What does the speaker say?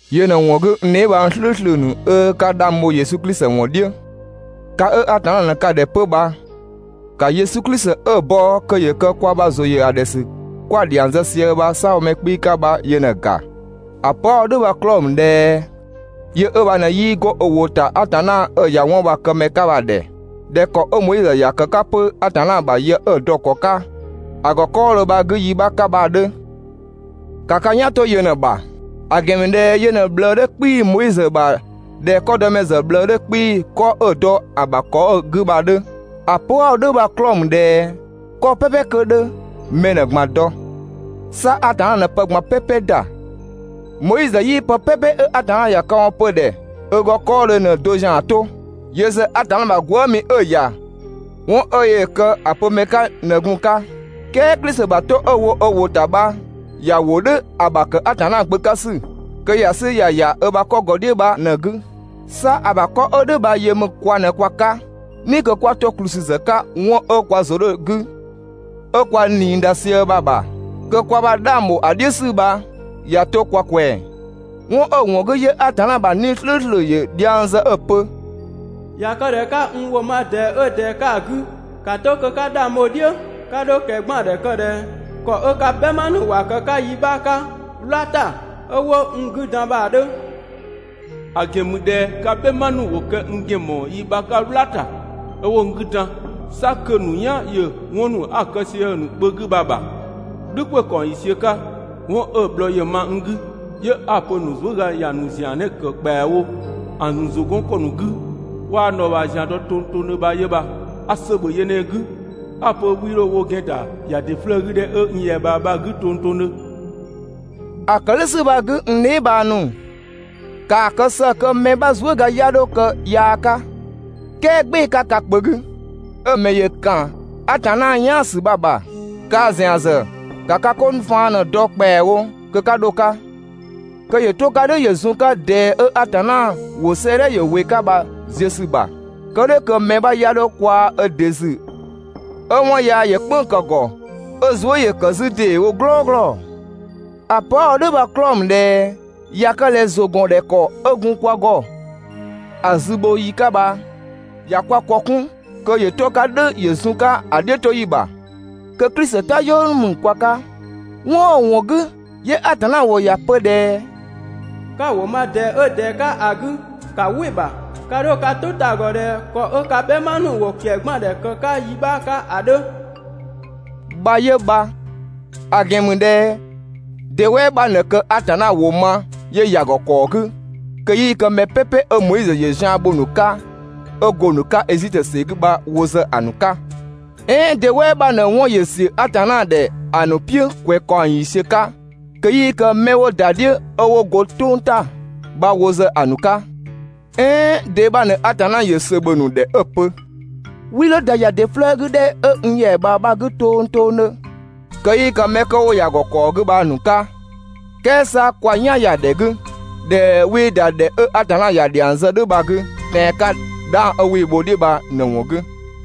Yö ꞊në‑ ‑wɔn 'gü, n dheebhang "slʋ̈ʋ̈slʋ̈ ‑nu 'ö 'ka 'dhang bho Yesu Klisi ‑wɔn "dhiʋ̈, ka 'ö Atanna ꞊në ka ‑dhɛ 'pö bha, ‑ka Yesu Klisi 'ö‑ bɔ kö ‑yö kë kwa ‑bha ‑zʋ ‑yö ‑dhɛ ‑sü 'kwa‑ dhiang zë sië bha‑ "saabhomɛ 'kpii‑ 'ka bha ꞊në‑ ‑ga. ‑A pö 'a‑ wo "dhʋ̈ bha‑ 'klɔɔ‑ ‑mü ꞊dhɛ yö ö bha ꞊në 'yii 'go ö ‑wʋ ‑ta Atanna 'ö‑ ‑ya 'wɔn bha‑ këmɛ 'ka bha‑ ‑dhɛ, ꞊dhɛ ‑kɔ 'ö Moizö ‑ya ‑kë 'ka 'pö Atanna ‑bha yë 'ö‑ dɔ‑ ‑kɔ 'ka ‑a ‑gɔ 'kɔɔdhö bha‑ 'gü yi 'bha 'ka bha‑ 'dhö. ‑Ka ka "yan 'to yö ꞊në‑ ‑bha, ‑a ‑gɛn ‑mü ꞊dhɛ yö ꞊në‑ ꞊bhlëë 'dhö 'kpii‑ Moizö ‑bha ꞊dhɛ 'kɔdɔmɛ ‑zë ꞊bhlëë 'dhö 'kpii‑ 'kɔ 'ö‑ dɔ ‑a ‑bha ‑kɔ 'ö‑ 'gü bha‑ 'dhö. ‑A pö 'a‑ wo "dhʋ̈ bha‑ 'klɔɔ‑ ‑mü ꞊dhɛ 'kɔ "pɛpɛ kö 'dhö, mɛ ꞊në‑ ꞊gban dɔ, 'sa Atanna ꞊në pë ꞊gban "pɛpɛ ‑da. Moizö 'yii pë "pɛpɛ 'ö Atanna ‑ya këwɔn pö‑ ‑dhɛ ö ‑gɔ 'kɔɔdhö ꞊në‑ do ‑zian 'to. Yö ‑zë Atanna ‑bha gwëëmi 'ö‑ ‑ya 'wɔn 'ö yöö‑ kë ‑a pö ‑mɛ 'ka ꞊në gun‑ 'ka. "Kɛɛ Klisi ‑bha 'to 'ö‑ wo ö ‑wʋ ‑ta bha ‑ya ‑wo "dhʋ̈ ‑a ‑bha ‑kë Atanna Gbö 'ka ‑sü, kö ‑ya 'sü ‑ya ‑ya ö ‑bha 'kɔ ‑gɔ "dhiʋ̈ bha ꞊në‑ 'gü. 'Sa ‑a ‑bha 'kɔ 'ö "dhʋ̈ bha yö ‑mü kwa ꞊në kwa 'ka "ni kö 'kwa 'to ‑kplü ‑sü ‑zë 'ka 'wɔn 'ö kwa ‑zʋ 'dhö‑ 'gü 'ö kwa ꞊nii ‑da sië bha‑ ‑bha, kö kwa ‑bha 'dhang ‑bho ‑a "dhiʋ̈ ‑sü bha ꞊ya 'to kwa ꞊kwɛng. 'Wɔn 'ö‑ ‑wɔn 'gü, 'yö Atanna ‑bha 'Nii‑ "slʋ̈ʋ̈slʋ̈ ‑yö dhiang zë 'ö‑ pö: «꞊Ya kë ꞊dhɛ 'ka n ‑wʋ ma ꞊dɛɛ 'ö ꞊dɛɛ 'ka ‑a 'gü, ‑ka 'to kö 'ka 'dhang bho‑ "dhiʋ̈, 'ka 'dho ꞊kɛgbaandhɛ kë ꞊dhɛ ‑kɔ 'ö ka "bhɛma ‑nu ‑wa ‑kë 'ka yi 'bha 'ka "wla ‑ta, 'ö 'wo n 'gü dan bha‑ 'dhö. ‑A ‑gɛn ‑mü ꞊dhɛ ka "bhɛma ‑nu ‑wo kë n ‑gɛn ‑mɔɔ yi 'bha 'ka "wla ‑ta, 'ö 'wo n 'gü dan, 'sa kö‑ ‑nu "yan ‑yö 'wɔn ‑nu 'a‑ kë sië‑ ‑nu kpö 'gü bha‑ ‑bha "dhʋ̈ ‑kwɛ ‑kaɔng ‑yiisiö 'ka. 'Wɔn 'ö‑ bhlɔɔ ‑yö ma n 'gü, 'yö 'a‑ pö‑ ‑nu zuëga ‑ya ‑nu ‑zian ꞊në‑ ‑kë ‑kpɛawo ‑a ‑nu ‑zʋ 'gɔn ‑kɔ ‑nu 'gü, 'waa n dhɔɔbhaa ‑zian dɔ tongtongdhö bha 'yö bha. A ‑sö ‑bhö yö ꞊në‑ 'gü, 'a‑ pö 'wii 'dho wo ‑gɛn ‑da ‑ya ‑dɩ 'flëë‑ 'gü ‑dhɛ 'ö n ‑yɛa ꞊bhaa bha‑ 'gü tongtongdhö.» ‑A ‑kë "dhʋ̈ ‑sü bha‑ 'gü, n dheebhang ‑nu, ‑kaa kë ‑së kö mɛ 'bha zuëga 'ya 'dho kë yaa 'ka, "kɛɛ "gbɩɩ‑ 'ka ka kpö 'gü, 'ö‑ ‑mɛ ‑yö ‑kan Atanna "yaan ‑sü bha‑ ‑bha. Kaa ‑zian ‑zë ‑ka ka 'ko ‑nu faan ꞊në‑ dɔ ‑kpɛawo kö 'ka 'dho‑ 'ka, kö ‑yö 'to‑ 'ka "dhʋ̈ ‑yö zun‑ 'ka ꞊dɛɛ 'ö Atanna ‑wʋ 'sëëdhɛ ‑yö ‑wɩ 'ka bha‑ ziö ‑sü ‑bha. Kë "dhʋ̈ kö mɛ 'bha 'ya 'dho kwaa ö ‑dɩ ‑zü 'ö 'wɔn yaa ‑yö "kpënng‑ ‑kë ‑gɔ 'ö‑ zuë" ‑yö ‑kë 'zü ‑deewo "glɔɔglɔ. ‑A pö 'a‑ wo "dhʋ̈ bha‑ 'klɔɔ‑ ‑mü ꞊dhɛ ꞊ya kë ꞊dhɛ ‑zʋ ‑gɔn ‑dhɛ ‑kɔ 'ö gun kwa ‑gɔ ‑a 'zü bho ‑yi 'ka bha, ꞊ya kwa ‑kɔ 'kun kö ‑yö 'to‑ 'ka "dhʋ̈ ‑yö zun‑ 'ka ‑a "dhiʋ̈toyi ‑bha, kö Klisi "tayɔɔ ‑nu ‑mü kwa 'ka. 'Wɔn 'ö‑ ‑wɔn 'gü, 'yö Atanna ‑wʋ ‑ya pö ꞊dhɛ: «'Ka‑ ‑wʋ ma ꞊dɛɛ 'ö ꞊dɛɛ 'ka‑ 'gü, 'ka "wɩ‑ ‑bha, 'ka 'dho ka "tʋ ta‑ ‑gɔ ꞊dhɛ ‑kɔ 'ö ka "bhɛma ‑nu ‑wo ꞊kɛgbaandhɛ ‑kë 'ka yi 'bha 'ka ‑a 'dhö» bha 'yö bha. ‑A ‑gɛn ‑mü ꞊dhɛ de "wɛɛ 'bha ꞊në kë Atanna ‑wʋ ma 'yö ‑ya ‑gɔ ‑kɔɔ 'gü kö 'yii kë mɛ "pɛpɛ 'ö Moizö ‑yö zian bho‑ ‑nu 'ka 'ö go‑ ‑nu 'ka Ezitö ‑sɛ 'gü bha wo ‑zë ‑a ‑nu 'ka? "Ɛɛn de "wɛɛ 'bha ꞊në 'wɔn ‑yö ‑siö Atanna ‑dhɛ ‑a ‑nu "piʋ̈ ‑kwɛ ‑kaɔng ‑yiisiö 'ka kö 'yii kë 'mɛ 'wo ‑da "dhiʋ̈ 'ö 'wo ga "tʋng ‑ta bha wo ‑zë ‑a ‑nu 'ka? "Ɛɛn de 'bha ꞊në Atanna ‑yö ‑sö ‑bhö ‑nu ‑dhɛ 'ö‑ pö: «'Wii 'dho ‑da ‑ya ‑dɩ 'flëë‑ 'gü ‑dhɛ 'ö n ‑yɛa ꞊bhaa bha‑ 'gü tongtongdhö.» kö 'yii kë 'mɛ 'kö 'wo ‑ya ‑gɔ ‑kɔɔ 'gü bha‑ ‑nu 'ka? "Kɛɛ 'sa kwa "yan ‑ya ‑dhɛ 'gü ꞊dhɛ 'wii ‑da ‑dhɛ 'ö Atanna ‑ya ‑dhiang zë "dhʋ̈ bha‑ 'gü tɛan‑ 'ka 'dhang 'wii‑ bho‑ "dhiʋ̈ bha ꞊në‑ ‑wɔn 'gü.